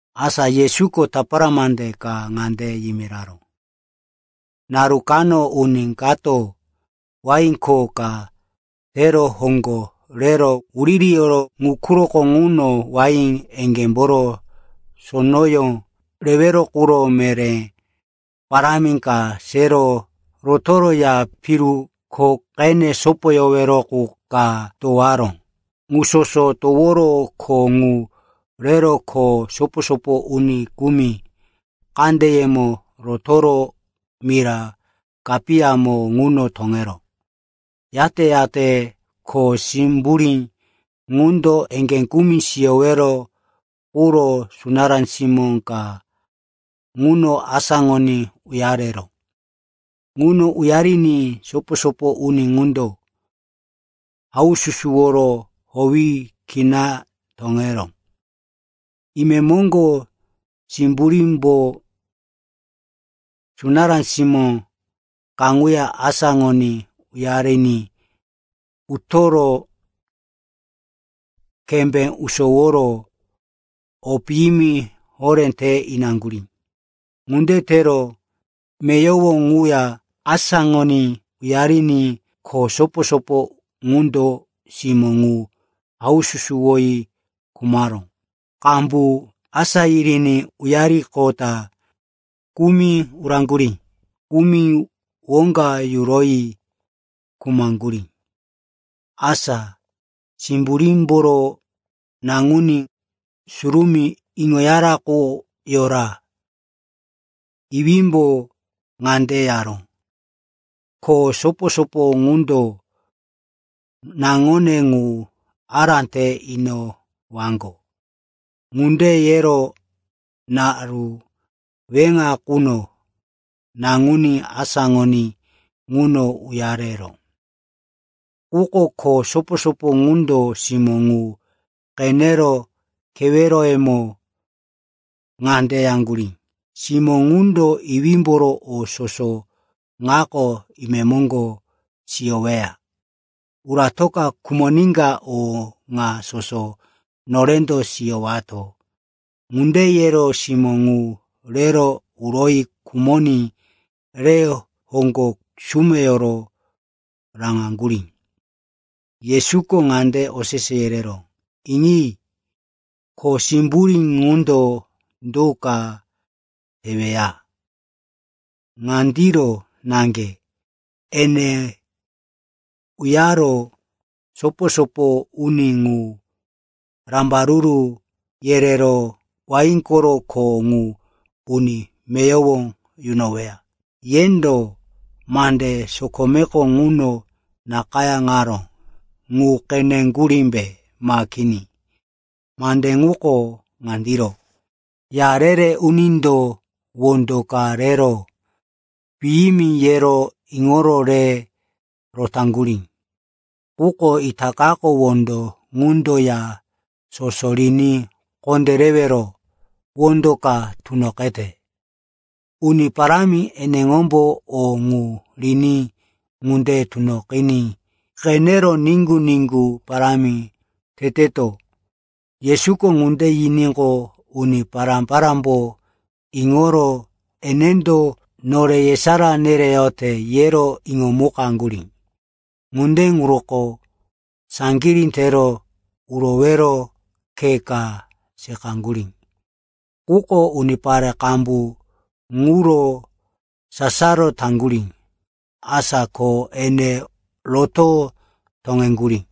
Asa Yesuko tapara mande ka ŋande yimiraró, “Naru kano uni kato wain kho ka tero hoŋgo rero wuririyoro ŋu quroko ŋuno wain eŋgémboro sonoyó rewero quro meré parámi ka sero rotoro ya piru kho qene sopoyowero qu ka towaró. Ŋu soso toworo kho ŋu rero kho sopo-sopo uni kumi kandeyemo rotoro mira kapiyamo ŋuno toŋeró. Yate-yate kho simburí ŋundo eŋgé kumi siyowero quro sunará simó ka ŋuno asáŋoní uyareró. Ŋuno uyariní sopo-sopo uni ŋundo haususuwo howi kina toŋeró. Imemoŋgo simburímbo sunará simó kaŋuya asáŋoní uyariní utoro kembé usoworo o piyimi horé te inaŋgurí. Ŋunde tero meyowo ŋuya asáŋoní uyariní kho sopo-sopo ŋundo simó ŋu haususuwoyi khumaró. Qambu asá yiriní uyariqota kumi uraŋgurí, kumi woŋga yuroyi khumaŋgurí. “Asa simburímboro naŋuní surumí iŋoyara qu yora. Iwímbo ŋande yaró, ‘Kho sopo-sopo ŋundo naŋone ŋu ará te inowaŋgo.’ Ŋunde yero naru weŋa quno naŋuní asáŋoní ŋuno uyareró. “Quko kho sopo-sopo ŋundo simó ŋu qenero keweroyemo ŋande yaŋgurí, ‘Simó ŋundo iwímboro o soso ŋako imemoŋgo siyoweya. Uratoka khumoníka o ŋa soso norendo siyowato.’ Ŋunde yero simó ŋu rero uroyi khumoní re hoŋgo sumeyoro raŋaŋgurí.” Yesuko ŋande osese yereró, “Iŋi, kho simburí ŋundo do ka teweya? Ŋandiro naŋge, ene uyaro sopo-sopo uni ŋu rambaruru yerero wain koro kho ŋu uni meyowo yunoweya. Yendo mande sokomeko ŋuno nakayáŋaró ŋu qeneŋgurímbe ma kini? Mande ŋuko ŋandiro: “‘Ya re-re unindo wondo ka rero piyimi, yero iŋoro re rotaŋgurí, quko itakako wondo ŋundo ya soso riní kondérewero wondo ka tunoqete. Uni Parámi eneŋombo o ŋu riní ŋunde tunoqiní qenero niŋgu-niŋgu parámi teteto.’” Yesuko ŋunde yiníqo, uni pará-parámbo iŋoro, enendo nore yesará nereyote, yero iŋomukaŋgurí. Ŋunde ŋuroko saŋgirí tero urowero khe ka seqaŋgurí. Quko unipare qambu ŋuro sasaro taŋgurí. Asa ko ene roto toŋeŋgurí.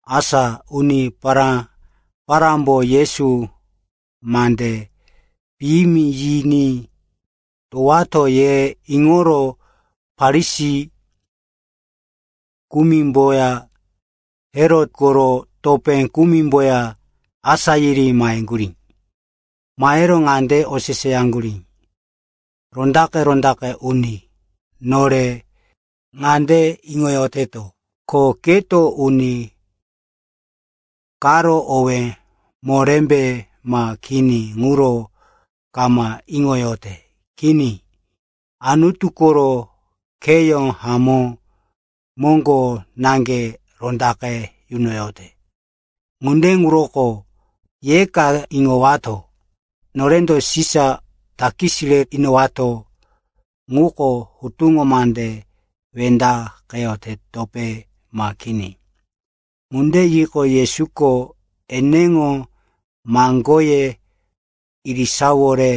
Asa uni pará-parámbo, Yesu mande piyimi yiní towowato, ye iŋoro Farisi kumimboya Herot koro topé kumimboya asá yiri maheŋgurí. Mahero ŋande oseseyaŋgurí, “Rondaqe-rondaqe uni, nore ŋande iŋoyoteto, ko keto uni karo owé morémbe ma kini ŋuro kama iŋoyote. Kini, Anutu koro kheyó hamó moŋgo naŋge rondaqe yunoyote. Ŋunde ŋuroko yeka iŋowato. Norendo Sisa takis re inowato ŋuko hutuŋo mande wendaqeyotepe ma kini?” Ŋunde yiqo, Yesuko eneŋo maŋgoye irisawore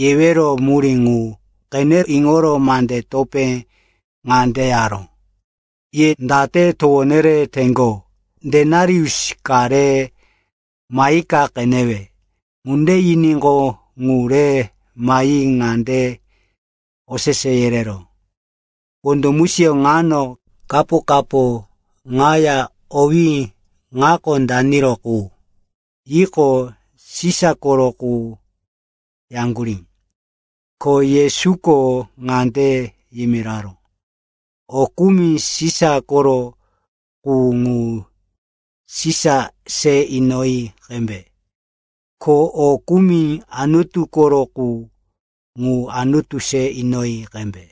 yewero murí ŋu qene iŋoro mande topé ŋande yaró, “Ye date towo nereteŋgo? Denarius ka re mahika qenewe.” Ŋunde yiníqo, ŋu re mahi ŋande osese yereró, “Wondo musiyó ŋano kapo-kapo ŋaya owí ŋako daniro qu?” Yiníqo, “Sisa koro qu,” yaŋgurí. Ko Yesuko ŋande yimiraró, “O kumi Sisa koro qu, ŋu Sisa se inoyi qembe. Ko o kumi Anutu koro qu, ŋu Anutu se inoyi qembe.”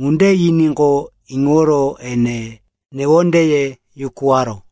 Ŋunde yiníqo, iŋoro ene newondeye yukuwaró.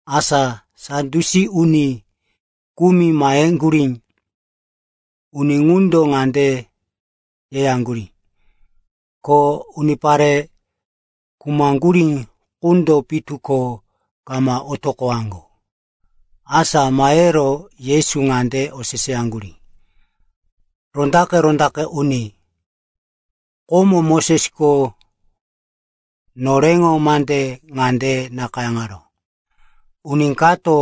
Asa Sadyusi uni kumi maheŋgurí. Uni ŋundo ŋande yeyaŋgurí, ko unipare khumaŋgurí qundo pitu ko kama otoqowaŋgo. Asa mahero Yesu ŋande oseseyaŋgurí, “Rondaqe-rondaqe uni, komo Mosesko noreŋo mande ŋande nakayáŋaró, ‘Uni kato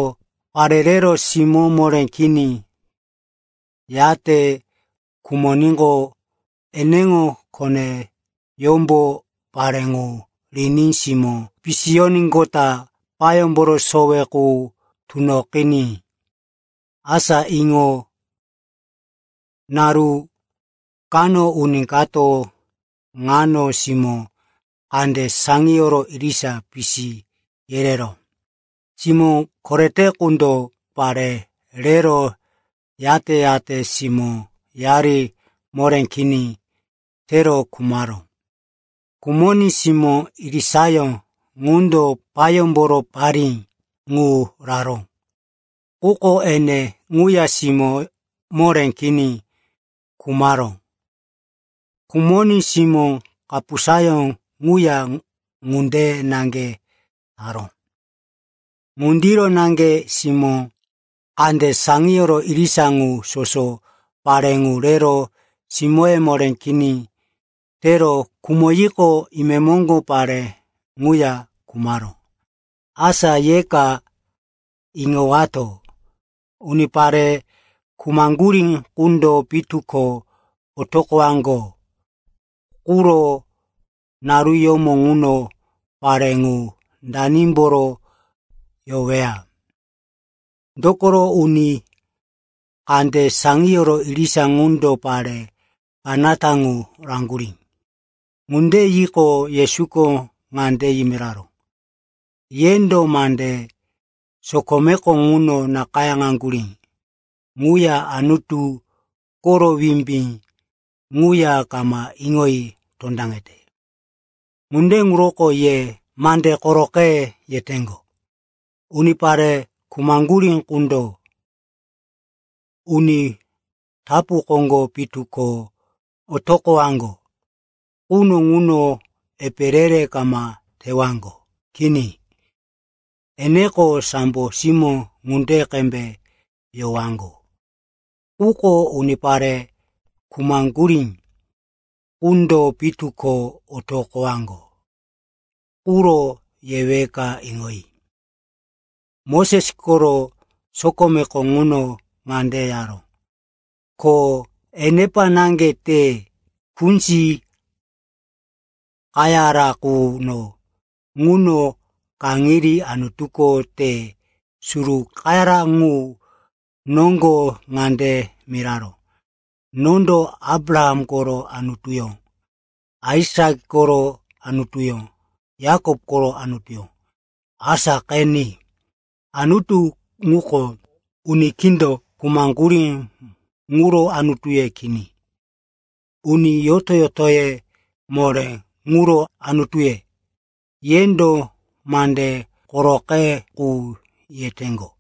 pare rero simó moré kini yate khumoníqo, eneŋo koneyómbo pare ŋu riní simó pisiyoníqota payómboro sowe qu tunoqiní.’ Asa iŋo. Naru kano uni kato naŋo-simó kande saŋiyoro irisa pisi yereró. Simó korete ŋundo pare rero, yate-yate simóyari moré kini tero khumaró. Khumoní simó irisayó ŋundo payómboro parí qu raró. Quko ene ŋuya simó moré kini khumaró. Khumoní simó kapusayó ŋuya ŋunde naŋge taró. Ŋundiro naŋge simó kande saŋiyoro irisa ŋu soso pare ŋu rero simóye moré kini tero khumoyiqo, imemoŋgo pare ŋuya khumaró. Asa yeka iŋowato, unipare khumaŋgurí qundo pitu ko otoqowaŋgo quro naruyómo ŋuno, pare ŋu, danimboro yoweya? Dokoro uni kande saŋiyoro irisa qundo pare kanata ŋu raŋgurí.” Ŋunde yiqo, Yesuko ŋande yimiraró, “Yendo mande sokomeko ŋuno nakayáŋaŋgurí ŋuya Anutu koro wimbí ŋuya kama iŋoyi tondaŋete. Ŋunde ŋuroko ye mande koroqe yeteŋgo. Unipare khumaŋgurí qundo uni tapu koŋgo pitu ko otoqowaŋgo quno ŋuno epe re-re kama tewaŋgo. Kini, eneko sambo simó ŋunde qembe yowaŋgo. Quko unipare khumaŋgurí qundo pitu ko otoqowaŋgo quro yeweka iŋoyi. Moses koro sokomeko ŋuno ŋande yaró, ko enepa naŋge te kunzi qayara quno ŋuno kaŋiní Anutuko te suru qayara ŋu noŋgo ŋande miraró, ‘Nondo Abraham koro Anutuyó, Aisak koro Anutuyó, Yakop koro Anutuyó.’ Asa qeni, Anutu ŋuko uni kindo khumaŋgurí ŋuro Anutuye kini. Uni yoto-yotoye moré ŋuro Anutuye.” Yendo mande koroqe qu yeteŋgo.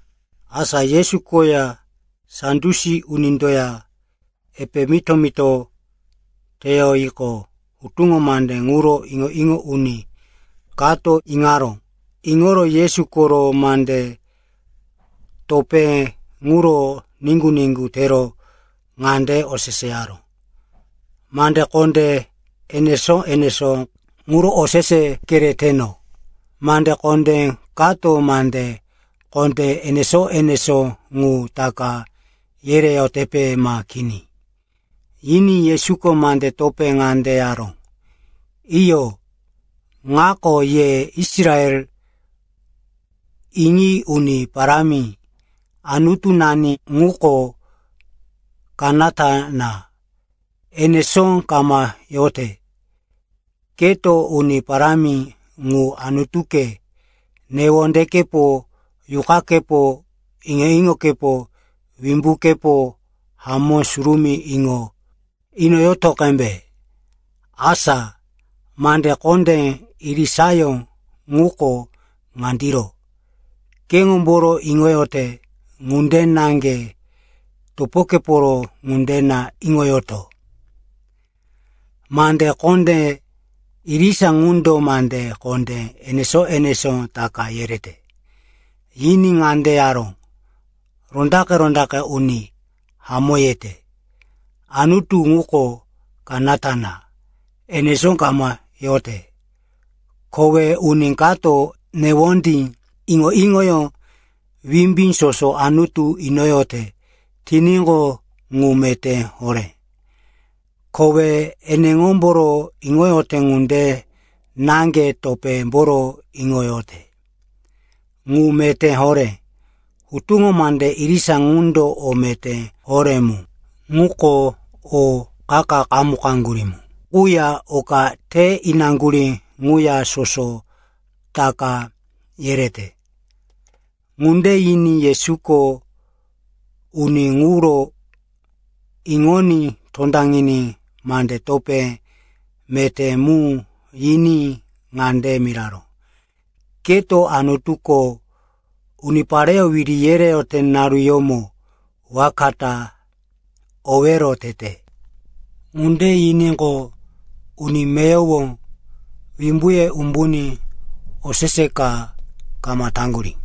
Asa Yesu koya Sadyusi unindoya epe mito-mito teyoyiqo, hutuŋo mande ŋuro iŋo-iŋo uni kato iŋaró. Iŋoro Yesu koro mande topé ŋuro niŋgu-niŋgu tero ŋande oseseyaró, “Mande kondé enesó-enesó ŋuro osese kereteno. Mande kondé kato mande kondé enesó-enesó ŋu taka yereyotepe ma kini?” Yiní Yesuko mande topé ŋande yaró, “Iyo, ŋako. ‘Ye Israel iŋi, Uni Parámi, Anutunani ŋuko kanata na, enesó kama yote. Keto Uni Parámi ŋu, Anutuke, newondekepo, yuqakepo, iŋo-iŋokepo, wimbukepo hamó surumí iŋo inoyoto qembe.’ Asa mande kondé irisayó ŋuko ŋandiro: ‘Keŋomboro iŋoyote ŋunde naŋge topokeporo ŋunde na iŋoyoto.’ Mande kondé irisa ŋundo mande kondé enesó-enesó taka yerete.” Yiní ŋande yaró, “Rondaqe-rondaqe uni, hamó yete. Anutu ŋuko kanata na, enesó kama yote. Kowe uni kato newondí, iŋo-iŋoyó, wimbí soso Anutu inoyote tiníqo, ŋu meté horé. Kowe eneŋomboro iŋoyote ŋunde naŋge topémboro iŋoyote ŋu meté horé. Hutuŋo mande irisa ŋundo o meté horé mu, ŋuko o qa-qa qamukaŋgurí quya oka te inaŋgurí ŋuya soso taka yerete.” Ŋunde yiní Yesuko uni ŋuro iŋoní tondaŋiní mande topé meté mu yiní ŋande miraró, “Keto Anutuko unipareyó wiri yereyote naruyómo waka ta owero tete.” Ŋunde yiníqo, uni meyowo wimbuye umbuní osese ka kama taŋgurí.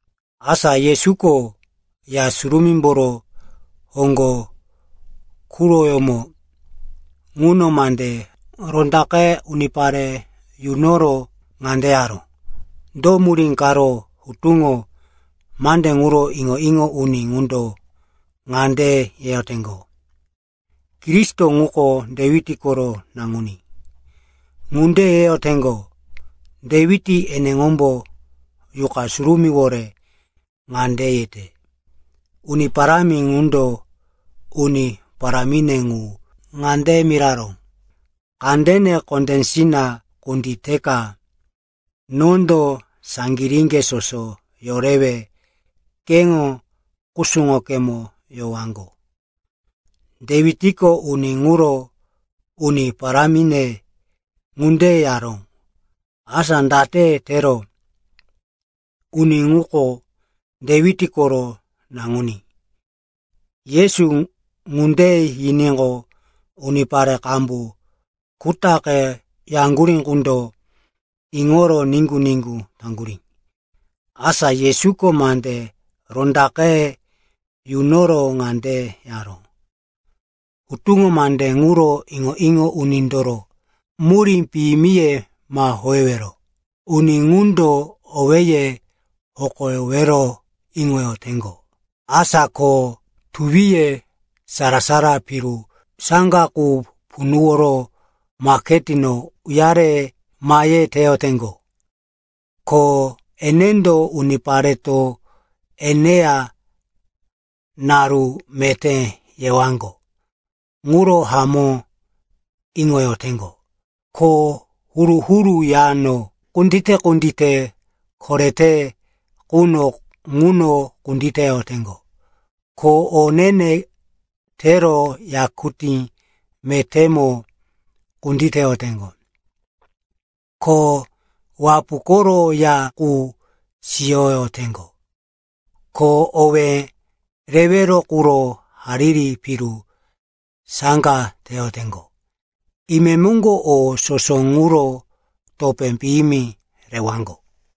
Asa Yesuko Ya Surumímboro hoŋgo quroyómo ŋuno mande rondaqe unipare yunoro ŋande yaró, “Do murí karo hutuŋo mande ŋuro iŋo-iŋo uni ŋundo ŋande yeyoteŋgo, ‘Kristo ŋuko Dewit koro naŋuní,’ ŋunde yeyoteŋgo? Dewit eneŋombo Yuqa Surumíwore ŋande yete, “‘Uni Parámi ŋundo uni parámine ŋu ŋande miraró, “Kandene kondésina kunditeka nondo saŋgiríŋge soso yorewe keŋo kusuŋokemo yowaŋgo.”’ Dewitko uni ŋuro ‘Uni parámine,’ ŋunde yaró. Asa date tero uni ŋuko Dewit koro naŋuní?” Yesu ŋunde yiníqo, unipare qambu kutaqe yaŋgurí qundo iŋoro niŋgu-niŋgu taŋgurí. Asa Yesuko mande rondaqe yunoro ŋande yaró, “Hutuŋo mande ŋuro iŋo-iŋo unindoro murí piyimiye ma howewero. Uni ŋundo owéye hokowero iŋoyoteŋgo. Asa ko tuwiye sara-sara piru saŋga qu punuworo maketino uyare mahe teyoteŋgo, ko enendo unipareto eneya naru meté yewaŋgo ŋuro hamó iŋoyoteŋgo. Ko huru-huru yano kundite-kundite korete quno ŋuno kunditeyoteŋgo. Ko o ne-ne tero yakutí metémo kunditeyoteŋgo. Ko wapu koro ya qu siyoteŋgo. Ko owé rewero quro hariri piru saŋga teyoteŋgo. Imemoŋgo o soso ŋuro topé piyimi rewaŋgo.”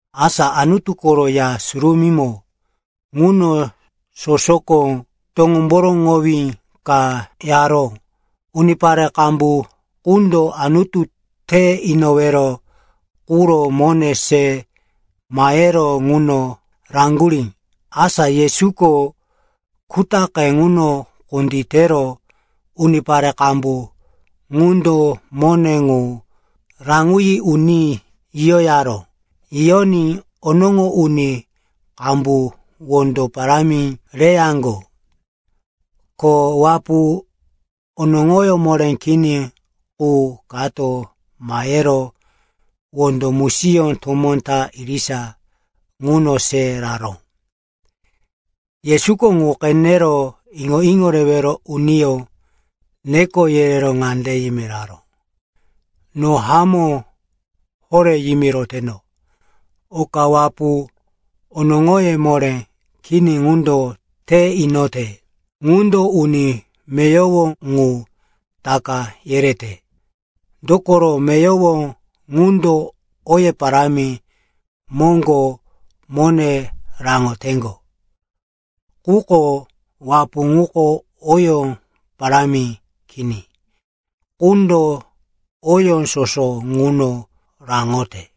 Asa Anutu koro Ya Surumímo ŋuno sosoko toŋomboroŋowí ka yaró. Unipare qambu qundo Anutu te inowero quro mone se mahero ŋuno raŋgurí. Asa Yesuko kutaqe ŋuno kunditero unipare qambu ŋundo mone ŋu raŋoyi uní yiyoyaró. Yiyoní onoŋo uni qambu wondo parámi reyaŋgo. Ko wapu onoŋoyó moré kini qu kato mahero wondo musiyó tomó ta irisa ŋuno se raró. Yesuko ŋu qenero iŋo-iŋo rewero uniyó neko yerero ŋande yimiraró, “No hamó horé yimiroteno, oka wapu onoŋoyó moré kini ŋundo te inote ŋundo uni meyowo ŋu taka yerete. Dokoro meyowo ŋundo oye parámi moŋgo mone raŋoteŋgo. Quko wapu ŋuko oyó parámi kini qundo oyó soso ŋuno raŋote.”